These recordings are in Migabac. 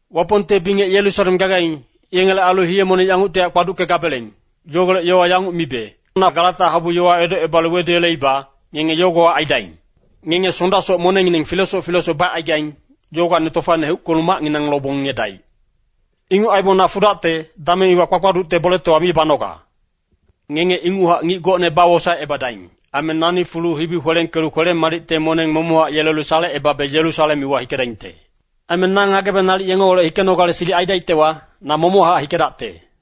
Wapongte bingec Yerusalem gagaing, yengele ailu hiye-moneng yanguctihac kpaduckegabeleng, yogolec yowa yanguc mibe, na Galata habu yowa edocebalu weduyeleiba, ngenge yogohac aidaing. Ngenge Sondasoc monengngineng filesoc filesoc bacaigaing, yogowacni tofaine heuckelu macnginang lobong ngiyedaic. Inguc aibong na fudacte, dameng iwa kpakpaducte boletowa mi banoga. Ngenge inguchac ngic gocne bawosaecebadaing. Aime nani fulu hibi kwelengkelu kwele-madicte moneng momoc yelelu salecebabe Yerusalem iwa hikedaingte. Aime na ngagebe nalic yengeholec hikenogale silic aidaictewa, na momochac hikedacte.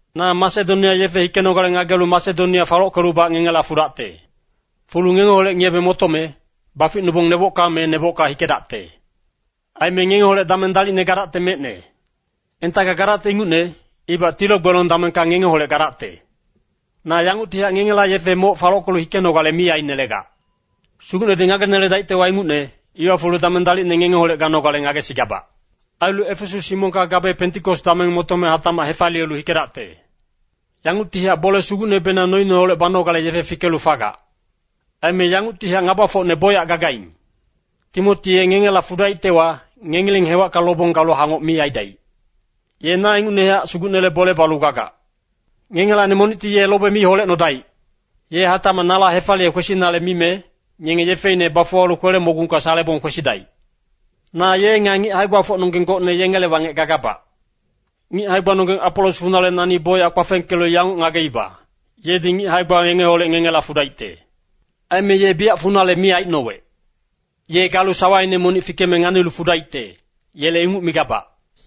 Na Masedonia yefe hikenogale ngagelu Masedonia falockelubac ngengela fudacte. Fulu ngengeholec ngiyebe motome, baficnubong nebocka me nebocka hikedacte. Aime ngengeholec dameng dalicne gadacte mecne. Entacka gadacte ingucne, ibac tilo-gbelong damengka ngengeholec gadacte. Na yanguctihac ngengela yefe moc falockelu hikenogale mi ainelegac. Sugucnedi ngageneledaictewa, ingucne, iwa fulu dameng dalicne ngengeholec ganogale ngagesigabac. Ailu Efesas himongka gabe Pentikos dameng motome hatacmac hefaliyelu hikedacte. Yanguctihac bole sugucnebenang noineholec banogale yefe fikelu fagac. Aime yanguctihac ngabafocne bocyac gagaing. Timoti ye ngengela fudaictewa, ngengileng hewacka lobong galu hangoc mi aidaic. Ye na ingucnehac Sugucnele bole balu gagac. Ngengelacni monicti ye lobe mi holecnodaic. Ye hatacmac nala hefaliye kwesinale mime, ngenge yefeine bafuwalu kwele-mogungka salebong kwesidaic. Na ye nga ngic hae-gbafocnonggeng gocne yengele wangec gagabac. Ngic hae-gbanonggeng Apolos funale nani bocyac kpafengkelu yanguc ngageiba, yedi ngic hae-gba yengeholec ngengela fudaicte. Aime ye biyac funale mi aicnowec. Ye galu sawaine monic fikeme nalic fudaicte, Yele inguc migabac.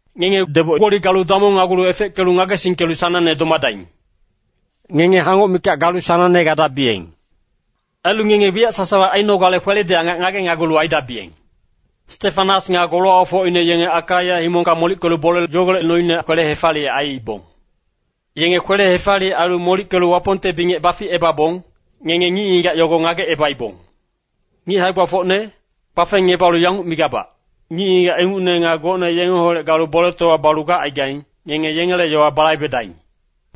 Ngenge deboc-gboli galu damongnagulu efeckelu ngagesingkelu sanangne domadaing. Ngenge hangoc mikac galu sanangne gadabiyeng. Ailu ngenge wiyac sasawa ainogale kweledi angac ngagenagulu aidabiyeng. Stefanas nga golowacfocine yenge Akaia himongka molickelu bole yogolec noine kwele-hefaliyec aiibong. Yenge kwele-hefaliyec ailu molickelu Wapongte bingec baficebabong, ngenge ngic-ngigac yogo ngagecebaibong. Ngic hae-gbafocne, kpafengngebalu yanguc migabac, Ngic-ngigac ingucne nga gocne yengeholec galu boletowa balu gacaigaing, ngenge yengele yowa balaibedaing.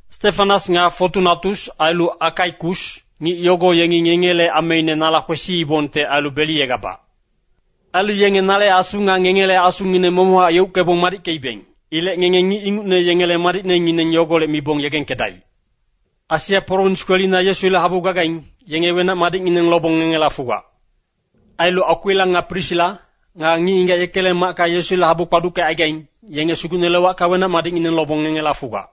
Stefanas nga Fotunatus ailu Akaikus, ngic yogo yengi ngengele ameine nala kwesiibongte ailu beliyegabac. Ailu yenge nale asu nga ngengele asungineng momochac yeuckebong madickeibeng. Ilec ngenge ngic ingucne yengele madicnengineng yogolec mibong yegengkedaic. Asia prowins kwelina Yesule habu gagaing, yenge wenac-madicngineng lobong ngengela fugac. Ailu Akwila nga Prisila, nga ngic-ngigac yekele macka Yesule habu kpaduckecaigaing, yenge Sugucnele wacka wenac-madicngineng lobong ngengela fugac.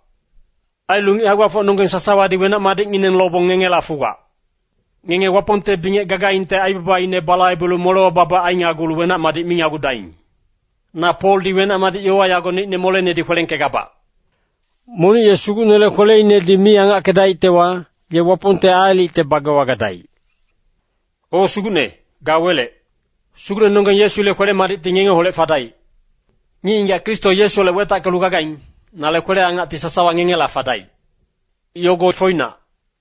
Ailu ngic hae-gbafocnonggeng sasawadi wenac-madicngineng lobong ngengela fugac. Ngenge Wapongte bingec gagaingte aibabaine balaibelu molewa babac ainagulu wenac-madic minagudaing. Na Poldi wenac-madic yowa yago neicne molenedi kwelengkegabac. Monic ye Sugucnele kweleinedi mi angackedaictewa, ye Wapongte aalicte bagewa gadaic. O Sugucne, ga welec. Sugucnenonggeng Yesule kwele-madicti ngengeholec fadaic. Ngic-ngigac Kristo Yesuholec wetackelu gagaing, nale kwele-angacti sasawa ngengela fadaic. Yogo foinac.